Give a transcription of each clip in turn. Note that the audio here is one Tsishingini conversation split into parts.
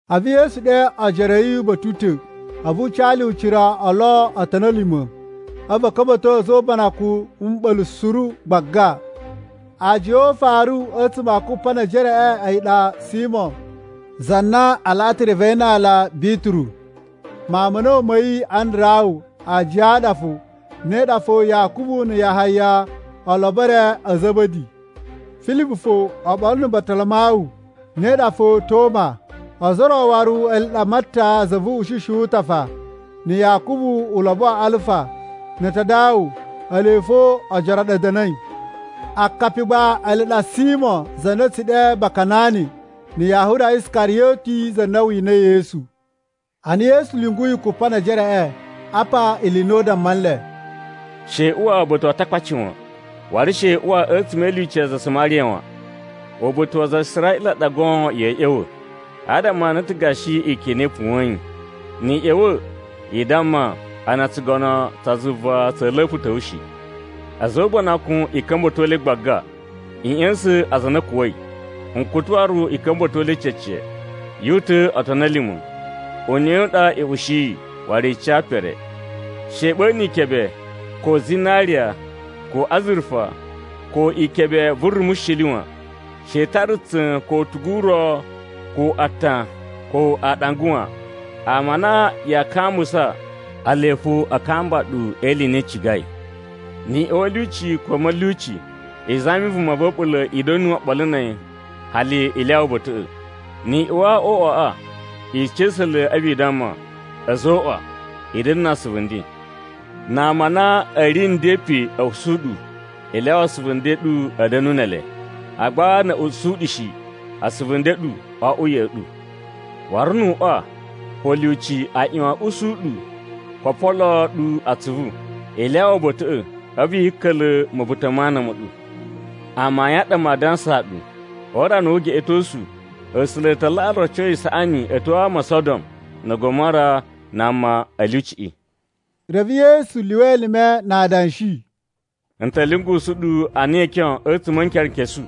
A̱vu Yesu ɗe ojoro a̱ yi uba̱ta̱ u ta̱, a̱vu u ca le ucira o lo otoni a̱ lima̱, a̱vu a̱ ka̱mba̱to a̱za̱ o ubanakun na̱ mɓa̱la̱ suru gbaga. Aajiya o ufaru a̱tsuma̱ a kupa ne ejereꞌe a̱yi ɗa Simo, za na a laꞌa ta̱ reve yi na aala Bituru. Mawun ma̱ a̱na̱wu ma̱ yi Andarawu aajiya ɗa fo, ne ɗa fo Yakubu na̱ Yahaya, olobo e re a̱ Za̱ba̱di. Filibu fo, oɓolo na̱ Batalamawu, ne ɗa fo Toma, ozo o ro waru ele ɗa Matta za vu uꞌushishi wu utafa, na̱ Yakubu ulobo wa Alfa, na̱ Tadawu ele fo ajiya ɗa a̱ da̱na̱i. Akapi gba ele ɗa Simo, za na a̱ tsu ɗe Bakanani, na̱ Yahuza Iskariyoti, za na winai Yesu. Ana Yesu lyunguyi Kupanejereꞌe, apa ili i na u damma nle, “She i uwa uba̱ta̱ wa Atakpaci wan, waru she i uwa a̱tsuma̱ e ilyuci ya aza a Samariya wan. Uba̱ta̱ wa aza a Israꞌila ɗa goon ya̱a̱ ꞌya̱wa̱, adama a na a̱ ta̱ gashi ikyon i na i puwa̱yin. Ni i ꞌya̱wa̱, i damma a na tsugono tsa zuva tsa̱a̱ la̱pa̱ ta̱wa̱ shi. A̱za̱ o ubanakun i ka̱mba̱to le gbaga, i ꞌya̱sa̱n aza a na a̱ kuwa̱i, nkutu waru i ka̱mba̱to le cece, yu uta̱a̱ otoni a̱ lima̱. Uneꞌe u ɗa i ushiyi, waru i ca pere. She i ɓa̱na̱ ikebe, ko zinariya, ko azurufa, ko ikebe vu rumushili wan. She i tara tsa̱n ko utugu u ro ko aatan ko aaɗanga wan. Ama a na yaa kambusa, ele fo a kamba ɗu e ili i na i cigai. “Ni i uwa a̱ lyuci ko a̱ ma̱lyuci, i zami vuma va̱ a̱ɓula̱ i da̱nu oɓolo na̱ a̱yi hali i lyawa uba̱ta̱ꞌa̱. Ni i uwa o uꞌwaꞌa, i ca̱sa̱ le a̱vu i damma, ‘A̱zoꞌwa, i da̱na̱ na asuvu nden.’ Na ama a na a̱ ri nden pe a̱ usu ɗu, i lyawa asuvu nden a̱ ɗu a̱ da̱na̱ ne ele. Agba na̱ a̱ usu ɗu shi, asuvu nden a̱ ɗu o oꞌwo ya̱ꞌa̱ ɗu. Waru nu uꞌwa ko lyuci a ꞌyuwan a̱ ushi ɗu ko o poloo ɗu atsuvu, i lyawa uba̱ta̱ꞌa̱, a̱vu yi ka̱ka̱la̱ ma̱buta̱ ma ana ma̱ ɗu. Amayun a ɗa maa dansaa ɗu, o urana wu ugeꞌetosu, A̱sula̱ a ta laꞌa roco isaꞌani a̱ tyo a ama o Sodom na̱ Gomora na ama a̱ lyuciꞌi!” Reve Yesu lyuwa elime na adanshi, “N ta̱ lyungusu ɗu ana ikyon a̱tsuma̱ a̱ nkerenkesu.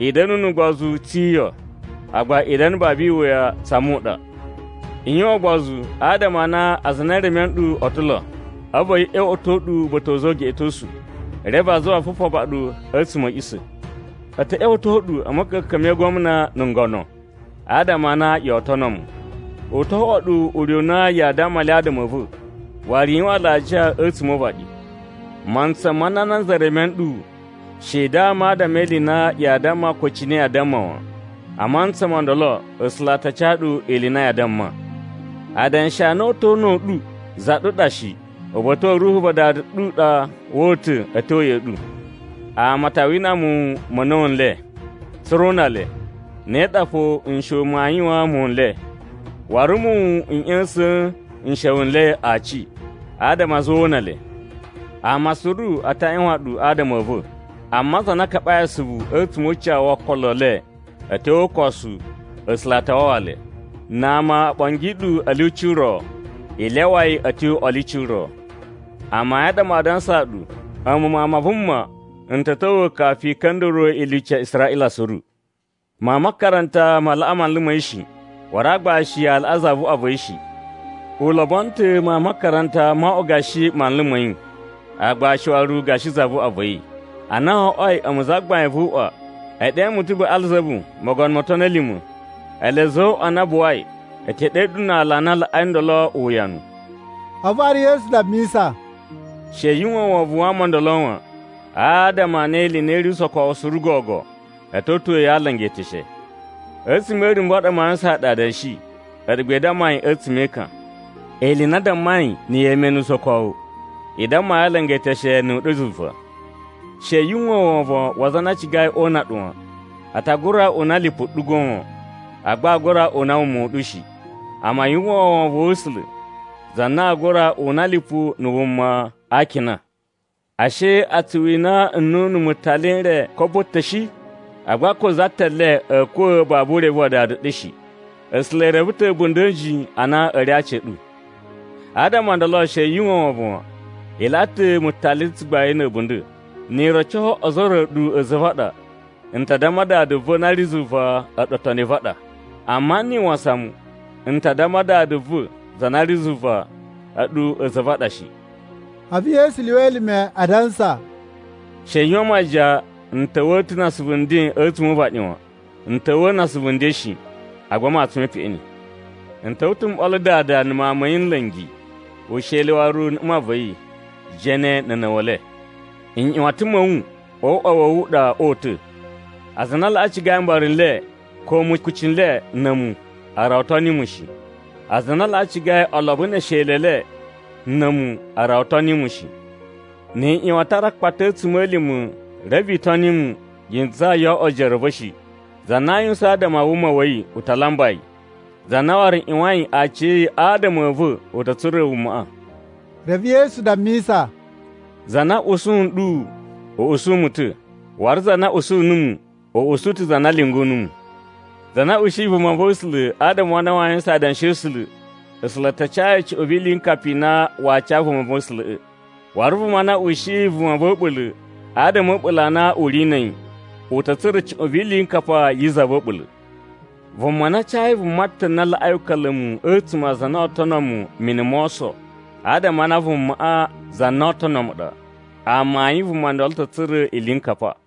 I da̱na̱ nu ugbozu tse iyo, agba i da̱na̱ babu iwuya tsa muɗa. I yuwan ugbozu, adama a na aza a na e reme ɗu a̱ ta̱ lo, a̱vu a̱ ꞌya̱wa̱to ɗu uba̱ta̱ wa̱ a̱za̱ o ugeꞌetosu, reve a zuwa a fufaba ɗu a̱tsuma̱ a̱ a̱ꞌisa̱. A̱ ta̱ ꞌya̱wa̱to ɗu a̱ ma̱ka̱ka̱n me igwamna na̱ ngono, adama a na yoo tono mu. U to oꞌwo ɗu ure u na yaa damma le adama a̱ va̱, waru i yuwan alajiya a̱tsuma̱ o uvaɗi. Mantsa ma na nanza reme nɗu, she i dama adama e ili i na yaa damma ko cine yaa damma wan. A mantsa mo ndolo, A̱sula̱ a ta ca ɗu ili i na yaa damma. Adanshi a na oo uta̱ o una̱ u ɗu za ɗu ɗa shi, uba̱ta̱ wa̱ Ruhu va Dada ɗu ɗa woo uta̱ a̱ tyo ya̱ꞌa̱ ɗu. “Ama a ta wina muwun ma̱ a̱na̱wu n le, tsa̱ra̱ o una le. Ne ɗa fo nsha̱wu maa yuwaan muwun n le. Waru muwun n ꞌya̱sa̱a̱n nsha̱wu n le aci, adama a zuwa o una le. Ama suru a ta ꞌyuwan ɗu adama a̱ va̱. Amma aza a na a kaɓai asuvu a̱tsuma̱ o ucawu wo okolo e le a̱ tyo o ukosu, A̱sula̱ a ta wawa le. Na ama o ɓongi ɗu a̱ lyuci ro, i lyawa yi i tyo a̱ lyuci ro. Amayun a ɗa maa dansaa ɗu, a̱mu Mawun ma Vuma, n ta̱ ta̱wa̱ kafu i ka̱nda̱ruwa̱ ilyuci ya Israꞌila suru. “Mawun ma makaranta ma laꞌa manlu ma̱ yi shi. Waru aagbashi a laꞌa zavuꞌwa va̱ yi shi. U lobono ta̱ mawun ma makaranta mo oꞌwo gashi manlu ma̱ yi, aagbashi waru gashi zavuꞌwa va̱ yi. Ana wo oꞌwoi a̱mu zagbain vu uꞌwa, e ɗe mu ta̱ Baꞌalzabu, mogono mo otoni a̱ lima̱, ele a̱za̱ o uꞌwa a na a buwai e te ɗe le na ala a na a laꞌai ndolo uwuyanu!” A̱vu waru Yesu dammisa, “She yu uwwa wovon wa ama o ndolo wan, adama a na ili i na i ri usokowu suru gogo, a̱ ta̱ uta̱a̱ yi a alanga e eteshe. A̱tsuma̱ e irumbu a ɗa maa yuwusan ɗu adanshi, a̱ɗu gba i damma yi a̱tsuma̱ e ekan. Ili i na a dammai na̱ yemenu usokowu, i damma yi alanga e eteshe nu uɗyo zuva. “She yu uwwa wovon wa aza a na a cigai o una ɗu wan. A ta gura una lipu ɗu goon, agba aa gura una wuma u ɗu shi. Amma yu uwwa wovon wa̱ A̱sula̱, za na aa gura una lipu na̱ wuma a akina. Ashe a tsu wina nnunu mutali n re kobo ta̱ shi? Agba ko za ta̱ le a̱a̱ kuwa̱ babu urevu wa Dada ɗu shi. A̱sula̱ e reve ta̱ a̱bunda̱ a̱ a̱nji a na a̱ ri a aci a̱ ɗu. Adama o ndolo she yu uwwa wovon wan. I laꞌa ta̱ mutali tsugbain na̱ a̱bunda̱. “Ni i roco ozo o ro a̱ɗu a̱za̱ a̱ va̱ a ɗa, n ta damma Dada va̱ na ri zuva a̱ɗu otoni a̱ va̱ a ɗa. Amma ni i wasan mu, n ta damma Dada va̱ za na ri zuva a̱ɗu a̱za̱ a̱ va̱ a ɗa shi.” A̱vu Yesu lyuwa elime adansa, “She i yuwan majiyan n ta̱wa̱a̱ ta̱ na asuvu nden a̱tsuma̱ o uvaɗi wan. N ta̱wa̱a̱ na asuvu nden shi, agba matsun me peꞌeni. N ta̱wa̱ ta̱ ‘m ɓolo dada na̱ mawun ma̱ yi nla̱ngi, usheli waru na̱ mma va̱ yi, jene na̱ a̱na̱wa̱le. Nꞌyuwatan ma̱ wu o uꞌwa wa̱ wu u ɗa oo uta̱!’ “Aza a na a laꞌa cigai mbara n le, ko mukuci n le na̱ a̱mu, a rawa o toni mu shi. Aza a na a laꞌa cigai olobo ne esheli e le na̱ a̱mu a rawa o toni mu shi. Ni i ꞌyuwan a tara akpata a̱ a̱tsuma̱lima̱ reve i toni mu, yi ntsaa yoo oꞌwo ojoro a̱ va̱ shi. Za na aa yuwusan adama a wuma wa̱ yi, u ta lamba yi. Za na waru ꞌyuwain aciya̱yi adama a̱ va̱ u ta̱ tsura̱ wumaꞌa.” Reve Yesu dammisa, “Za na ushi nɗu, u ushi mu ta̱. Waru za na usu numu, u usu ta̱ za na lyungu numu. Za na ushiyi vumava̱sula̱ adama a na waa yuwusan adanshi a̱ A̱sula̱, A̱sula̱ a ta ca yi cuꞌun vi iliyinkapa i na waa ca vumava̱sula̱ꞌa̱. Waru vuma na ushiyi vuma va̱ a̱ɓula̱ adama a̱ a̱ɓula̱ a na u ri na̱ a̱yi, u ta̱ tsura̱ cuꞌun vi iliyinkapa yi za va̱ a̱ɓula̱. Vuma na cayi vuma ta̱ na laꞌai uka̱la̱mu a̱tsuma̱ a aza a na oo tono mu mini mo oso, adama a na vumaꞌa za na oo tono mu ɗa, amayun vuma ndolo ta̱ tsura̱ iliyinkapa.”